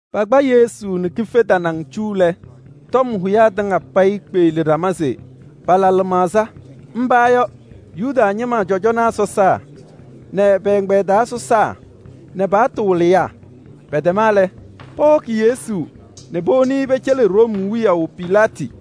Pakpa Yesu nɛ kife tanaŋ cu lɛ, tɔm hʋyaa tɩŋa payɩ kpeɣli ɖama se pala lɩmaɣza. Mba yɔ: Yuda ñɩma cɔjɔnaa sɔsaa nɛ pɛ-ɛgbɛyɛ taa sɔsaa nɛ pa-paɣtʋ wɩlɩyaa. Pɛtɛma lɛ, pɔhɔkɩ Yesu nɛ powoni pɛcɛlɩ Room wiyaʋ Pilaatɩ.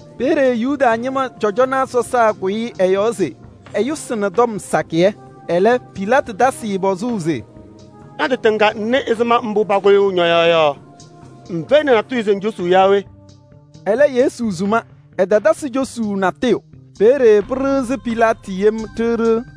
Peeye Yuda ñɩma cɔjɔnaa sɔsaa kʋyɩ ɛ-yɔɔ se ɛyʋsɩ tɔm sakɩyɛ. Ɛlɛ Pilaatɩ tasɩ-ɩ pɔzʋʋ se: “Ña-tɩ tɩŋa ŋnɩ ɛzɩma mbʋ pakʋyʋʋ ñɔ-yɔɔ yɔ. Ŋfɛyɩnɩ natʋyʋ se ŋcosuu yaa we?” Ɛlɛ Yesu suma, ɛtatasɩ cosuu natʋyʋ. Peeye pɩɖɩɣzɩ Pilaatɩ yem ɖiɣ ɖiɣ.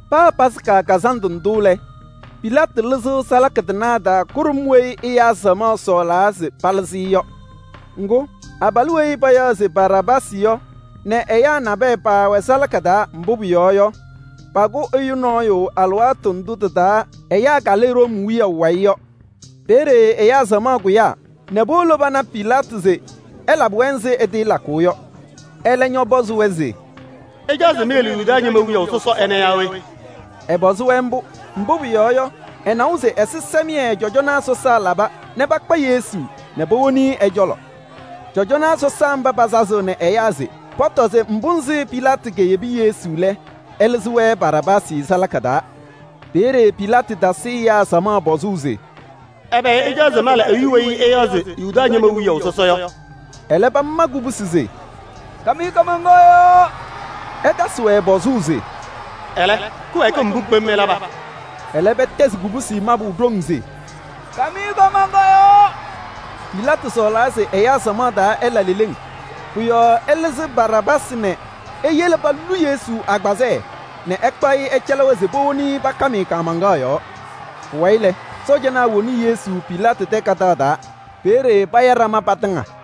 Meheyiɣ-mɩ se paa Yomiye Taa Lɩʋ Kazandʋ ndʋ lɛ, Pilaatɩ lɩzɩɣ salaka tɩnaa taa kʋɖʋm weyi ɛyaa samaɣ sɔɔlaa se palɩzɩ-ɩ yɔ. Ŋgʋ, abalʋ weyi payaɣ se Baraabaasɩ yɔ nɛ ɛyaa nabɛyɛ paawɛ salaka taa. Mbʋ pʋyɔɔ yɔ, paakʋ ɛyʋ nɔɔyʋ alɩwaatʋ ndʋ tɩ-taa ɛyaa kalɩ Room wiyaʋ wayɩ yɔ. Peeye ɛyaa samaɣ kʋyaa nɛ powolo pana Pilaatɩ se ɛlabɩ-wɛ ɛzɩ ɛtɩɩlakʋʋ yɔ. Ɛlɛ ñɔpɔzɩ-wɛ se: “Ɩcaɣ se meyele Yuda ñɩma wiyaʋ sɔsɔ ɛnɛ yaa we?” Ɛpɔzɩ-wɛ mbʋ, mbʋ pʋyɔɔ yɔ, ɛnawa se ɛzɩsɛmɩyɛ cɔjɔnaa sɔsaa laba nɛ pakpa Yesu nɛ powoni-i ɛ-cɔlɔ. Cɔjɔnaa sɔsaa mba pasazaɣnɩ ɛyaa se pɔtɔ se ɛzɩ Pilaatɩ keyele Yesu lɛ, ɛlɩzɩ-wɛ Baraabaasɩ salaka taa. Peeye Pilaatɩ tasɩ ɛyaa samaɣ pɔzʋʋ se: “Ɛbɛ ɩcaɣ se mala ɛyʋ weyi ɩyaɣ se Yuda ñɩma wiyaʋ sɔsɔ yɔ?” Ɛlɛ pama kubusi se: “Kam-ɩ kaamaŋkaɣ yɔɔ!” Ɛtasɩ-wɛ pɔzʋʋ se: “Ɛlɛ kɩwɛɛkɩm mbʋ kpem ɛlaba?” Ɛlɛ pɛtɛzɩ kubusi mabʋ ɖoŋ se: “Kam-ɩ kaamaŋkaɣ yɔɔ!” Pilaatɩ sɔɔlaa se ɛyaa samaɣ taa ɛla leleŋ. Pʋ-yɔɔ ɛlɩzɩ Baraabaasɩ nɛ eyele polu Yesu agbazɛɛ nɛ ɛkpaɣ-ɩ ɛcɛlɩ-wɛ se powoni-i pakam-ɩ kaamaŋkaɣ yɔɔ. Pʋwayɩ lɛ, sɔɔjanaa woni Yesu Pilaatɩ tɛ kadaɣ taa. Peeye paya ɖama patɩŋa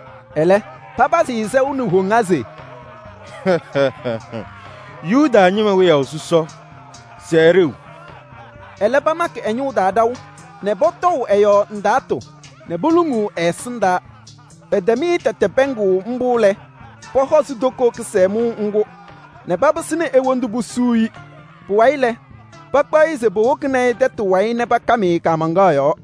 Ɛlɛ, papazɩ-ɩ sɛʋ nɛ woŋa se: “Yuda ñɩma wiyaʋ sɔsɔ! Sɛɛ ɖeu!” Ɛlɛ pamakɩ ɛ-ñʋʋ taa ɖaʋ nɛ pɔtɔʋ ɛ-yɔɔ ndaatʋ nɛ poluŋuu ɛ-ɛsɩndaa. Pɛtɛm-ɩ tɛtɛ pɛɛŋʋʋ mbʋ lɛ, pɔhɔzɩ toko kɩsɛmʋʋ ŋgʋ nɛ papɩsɩnɩ e-wondu posuu-i. Pʋwayɩ lɛ, pakpaɣ-ɩ se powokini tɛtʋ wayɩ nɛ pakam-ɩ kaamaŋkaɣ yɔɔ.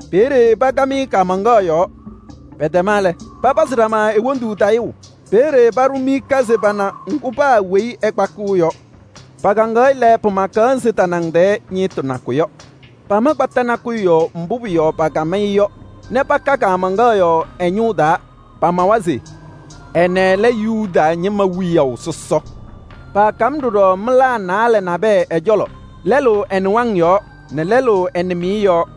Peeye pakam-ɩ kaamaŋkaɣ yɔɔ. Pɛtɛma lɛ, patayɩɣ ɖama e-wondu. Peeye paɖʋ miika se pana ŋgʋ paa weyi ɛkpakɩɣ yɔ. Pakaŋaɣ-ɩ lɛ, pɩmaɣ ɛzɩ ninɖiɣyaa wɩsɩ yɔ. Paama kpata nakʋyʋ yɔɔ mbʋ pʋ-yɔɔ pakam-ɩ yɔ nɛ paka kaamaŋkaɣ yɔɔ ɛ-ñʋʋ taa. Pamawa se: “Ɛnɛ lɛ Yuda ñɩma wiyaʋ sɔsɔ.” Paakam ɖɔɖɔ mɩlaa naalɛ nabɛyɛ ɛ-cɔlɔ: lɛlʋ ɛ-nɩwaŋ yɔɔ nɛ lɛlʋ ɛ-nɩmɩyɛ yɔɔ. [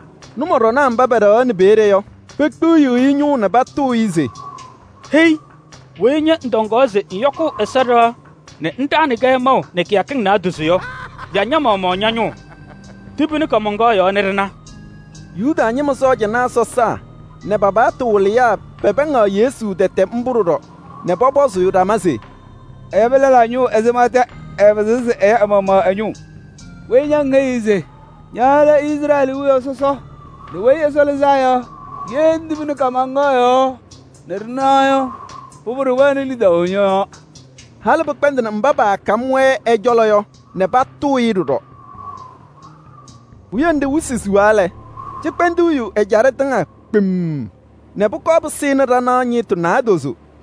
Nʋmɔɖɔnaa mba pɛɖɛɣaɣnɩ peeye yɔ, pekpiɣyiɣ-i ñʋŋ nɛ patʋʋ-ɩ se: “Hei! Weyi ña ŋtɔŋaɣ se ŋyɔkʋʋ Ɛsɔ ɖɩɣa nɛ ŋɖaɣnɩ-kɛ maʋ nɛ kɩyakɩŋ naadozo yɔ, ya ña-maɣmaɣ ña-ñʋʋ! Tibini kaamaŋkaɣ yɔɔ nɛ ɖɩna.” Yuda ñɩma cɔjɔnaa sɔsaa nɛ pa-paɣtʋ wɩlɩyaa pɛpɛɛŋaɣ Yesu tɛtɛ mbʋ ɖɔɖɔ nɛ pɔpɔzʋʋ ɖama se: “Ɛyabɩ lɛlaa ñʋʋ ɛzɩma tɛ ɛɛpɩzɩɣ se ɛya ɛ-maɣmaɣ ɛ-ñɩŋgʋ! Weyi ña ŋheyiɣ se ña lɛ Izrɛɛlɩ wiyaʋ sɔsɔ nɛ Weyi Ɛsɔ Lɩzaa Yɔ, ye ŋtibini kaamaŋkaɣ yɔɔ nɛ ɖɩna yɔ, pʋbʋ ɖɩwɛɣnɩ lidaʋ ñɔ-yɔɔ.” Halɩ pɩkpɛndɩnɩ mba paakam-wɛ ɛ-cɔlɔ yɔ nɛ patʋʋ-ɩ ɖɔɖɔ. Puwiye nɖɩ wɩsɩ siɣa lɛ, cɩkpɛndʋʋ yu ɛjaɖɛ tɩŋa kpemm nɛ pʋkɔɔ pɩsɩnɩ ɖanaɣ ñɩɣtʋ naadozo.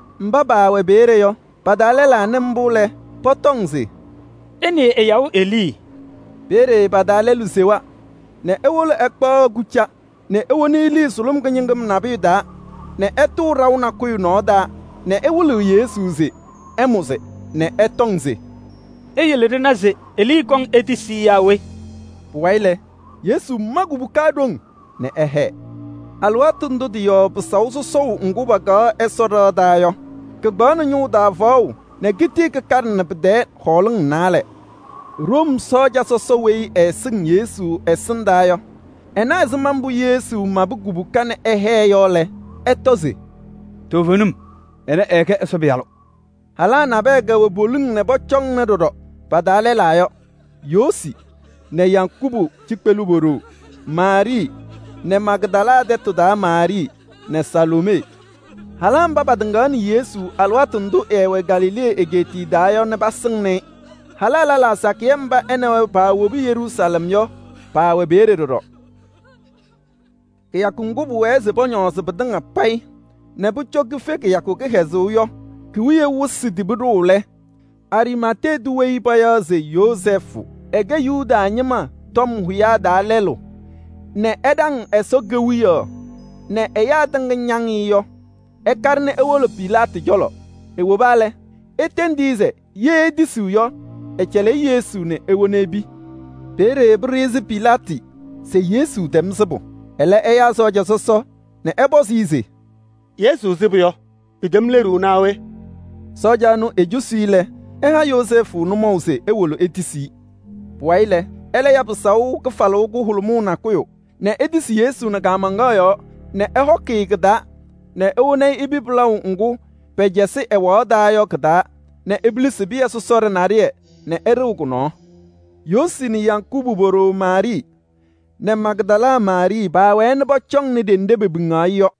Mba paawɛ peeye yɔ, pa-taa lɛlaa nɩ mbʋ lɛ, pɔtɔŋ se: “Ɩnɩɩ ɛyaɣʋ Elii!” Peeye pa-taa lɛlʋ sewa nɛ ewolo ɛkpaɣ kʋca nɛ ewoni elii sʋlʋm kɩñɩŋɩm nabʋyʋ taa nɛ ɛtʋʋ ɖaʋ nakʋyʋ nɔɔ taa nɛ ɛwɩlɩɣ Yesu se ɛmʋzɩ nɛ ɛtɔŋ se: “Iyele ɖɩna se Elii kɔŋ etisi-i yaa we?” Pʋwayɩ lɛ, Yesu ma kubuka ɖoŋ nɛ ɛhɛɛ. Alɩwaatʋ ndʋ tɩ-yɔɔ pɩsaʋ sɔsɔʋ ŋgʋ paakaɣ Ɛsɔ ɖɩɣa taa yɔ, kɩkpaɣnɩ ñʋʋ taa faɣʋ nɛ kitii kɩkaɖɩnɩ pɩ-tɛɛ hɔɔlɩŋ naalɛ. Room sɔɔja sɔsɔ weyi ɛɛsɩŋ Yesu ɛsɩndaa yɔ, ɛna ɛzɩma mbʋ Yesu mabɩ kubuka nɛ ɛhɛɛ yɔ lɛ, ɛtɔ se: “Toovenim, ɛnɛ ɛɛkɛ Ɛsɔ Pɩyalʋ!” Halaa nabɛyɛ kɛwɛ poliŋ nɛ pɔcɔŋna ɖɔɖɔ. Pa-taa lɛlaa yɔ: Yoosi nɛ Yakubu cikpelu po-ɖoo Maarɩɩ nɛ Magdala tɛtʋ taa Maarɩɩ nɛ Saloomee. Halaa mba patɩŋaɣnɩ Yesu alɩwaatʋ ndʋ ɛɛwɛ Galilee egeetiye taa yɔ nɛ pasɩŋnɩ-ɩ. Halaa lɛlaa sakɩyɛ mba ɛ nɛ wɛ paawobi Yeruusalɛm yɔ, paawɛ peeye ɖɔɖɔ. Kɩyakʋ ŋgʋ pʋwɛɛ se pɔñɔɔzɩ pɩtɩŋa payɩ nɛ pʋcɔ kife kɩyakʋ kɩhɛzʋʋ yɔ ki-wiye wɩsɩ tibi ɖʋʋ lɛ, Ariimatee tʋ weyi payaɣ se Yozɛɛfʋ, ɛkɛ Yuda ñɩma tɔm hʋyaa taa lɛlʋ nɛ ɛɛɖaŋ Ɛsɔ Kewiyaɣ nɛ ɛyaa tɩŋa ñaŋ-ɩ yɔ, ɛkaɖɩ nɛ ewolo Pilaatɩ cɔlɔ. Ewoba lɛ, etendi-i se ye etisiɣ yɔ, ɛcɛlɩ-ɩ Yesu nɛ ewona epi. Peeye pɩɖɩɣzɩ Pilaatɩ se Yesu tɛm sɩbʋ, ɛlɛ ɛyaa sɔɔja sɔsɔ nɛ ɛpɔzɩ-ɩ se: “Yesu sɩbʋ yɔ, pɩtɛm leɖuu naa we?” Sɔɔja ɛnʋ ecosi-i lɛ, ɛha Yozɛɛfʋ nʋmɔʋ se ewolo etisi-i. Pʋwayɩ lɛ, ɛlɛ ya pɩsaʋ kɩfalʋʋ kʋhʋlʋmʋʋ nakʋyʋ nɛ etisi Yesu nɛ kaamaŋkaɣ yɔɔ nɛ ɛhɔkɩ-ɩ kɩ-taa nɛ ewoni-i epi pɩlaʋ ŋgʋ pɛcɛsɩ ɛwaɣ taa yɔ kɩ-taa nɛ epilisi pɩyɛ sɔsɔɖɛ naɖɩyɛ nɛ ɛɖɩɣ kʋ-nɔɔ. Yoosi nɛ Yakubu po-ɖoo Maarɩɩ nɛ Magdala Maarɩɩ paawɛɛ nɛ pɔcɔŋnɩ ɖenɖe pepiŋaɣ-ɩ yɔ.